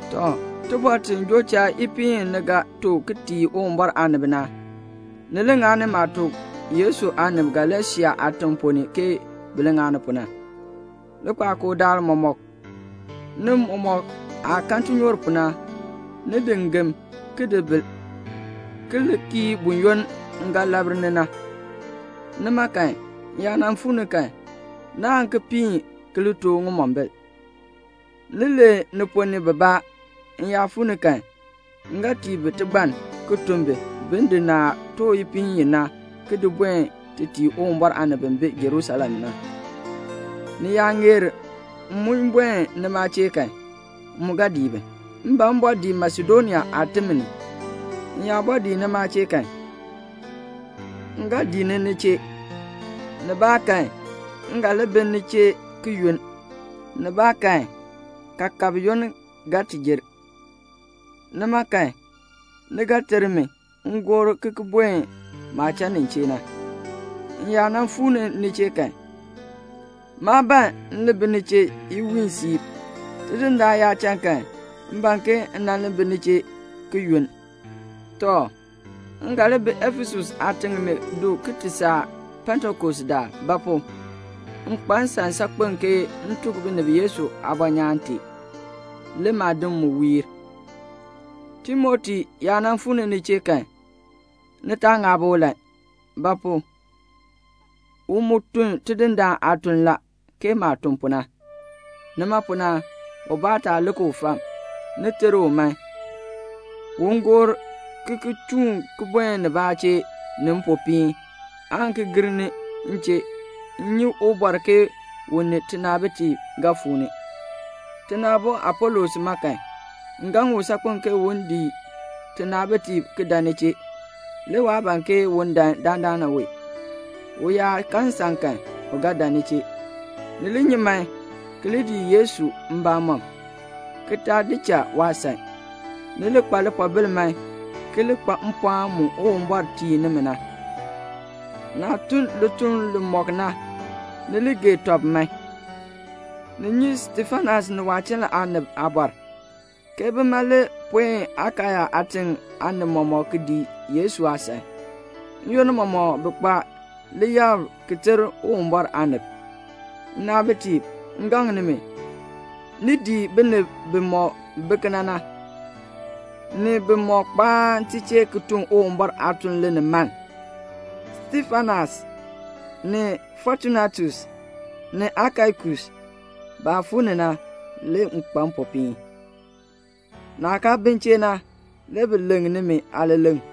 Tɔ, tibɔr ti joo cha ipiin i ni ga too ki tii Uwumbɔr aanib na, ni li ŋani maah tuk Yesu aanib Galasia aatiŋ ponn ni ke bi li ŋani pu na. Likpakool daal mɔmɔk, ni mɔmɔk aah kan tinyoor pu na, ni di ngem, ki di bil, ki li kii buyoonn m ga labr ni na. Nima kan, m yaa nan fuu ni kan, naan ki piin ki li too ŋimombil. Ni lee ni ponn ni bibaa. M yaa fuu ni kan, m ga tii bi tigbann, ki tun bi, bin di naah too ipiin i na ki di buen ti tii Uwumbɔr aanib bi bi Jerusalem na. Ni yaa ŋeer m mu buen nima chee kan, m mu ga dii bi. M ban m bɔɔ dii Masedonia aatim ni. M yaa bɔɔ dii nima chee kan, m ga dii ni ni chee. Nibaakan m ga li bi ni chee ki yunn, nibaakan kaakab yoonn ga ti jer. Nima kan, ni ga ter mi m gor ki ki buen maah cha nin chee na. M yaa nan fuu ni ni chee kan, maa ban m nan li bi ni chee iwiin siib. Tidindaan yaa cha kan, m ban ke m nan li bi ni chee ki yunn. Tɔ, m ga li bi Efesus aatiŋ ni du ki ti saa Pentekost daal; ba pu? m kpa nsan saakpen ke m tuk binib Yesu aabɔnyaan tee. Le maadim mu wiir. Timoti yaa nan fuu ni ni chee kan, ni taa ŋaab ulan; ba pu? u mu tun Tidindaan aatuln la, ke maah tun pu na. Nima pu na, ubaa taa lik u fam. Ni ter u man, un gor ki ki chuun ki buen nibaa chee ni mpopiin, aan ki ki gir ni m chee; m nyi ubɔr ke u ni tinaabitiib ga fuu ni. Tina aabo Apolos ma kan, m gaŋ u saakpen ke un dii tinaabitiib ki dan ni chee, le waa ban ke un dan dandana wee. U yaa kan nsan kan, u ga dan ni chee. Ni li nyi man, ki li dii Yesu mbamɔm, ki taa di cha waasan. Ni li kpa lipoobil man, ki li kpa mpɔɔn mu Uwumbɔr tii nimi na. Naah tun lituln limɔk na, ni li gee tɔb man. Ni nyi Stefanas ni waachiln ni aanib aabɔr, ke bima li puen Akaya aatiŋ aanib mɔmɔk ki dii Yesu aasan. N-yoonn mɔmɔk bi kpa liyab ki ter Uwumbɔr aanib. Nnaabitiib, m gaŋ nimi, ni dii binib bimɔk bi kena na, ni bimɔk kpaan ti chee ki tun Uwumbɔr aatuln linimaln. Stefanas ni Fotunatus, ni Akaikus, baah fuu ni na, le m kpa mpopiin. Naah kaa bi m chee na, le bi leŋ nimi aaleleŋ.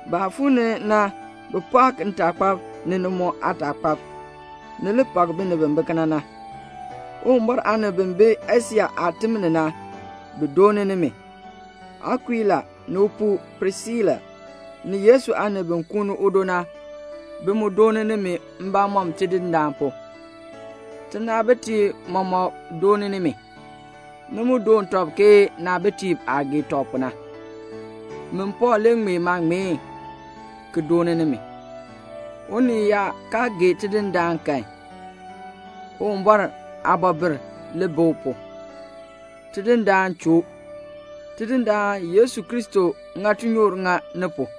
Baah fuu ni na bi pɔɔk ntaakpab, ni ni mu aataakpab. Ni li pak binib bi bi kena na. Uwumbɔr aanib bi bi Asia aatim ni na, bi dooni nimi. Akuila ni upuu Prisila, ni Yesu aanib bi kuuni udo na, bi mu doon nimi mbamɔm Tidindaan pu. Tinaabitiib mɔmɔk dooni nimi. Ni mu doon tɔb ke naabitiib aah gee tɔb pu na. Min Pɔɔl li ŋmee maaŋmeen ki dooni nimi. Unii yaa kaa gee Tidindaan kan, Uwumbɔr aabɔbil li bi u pu. Tidindaan choo. Tidindaan Yesu Kristo ŋa tinyoor ŋa ni pu.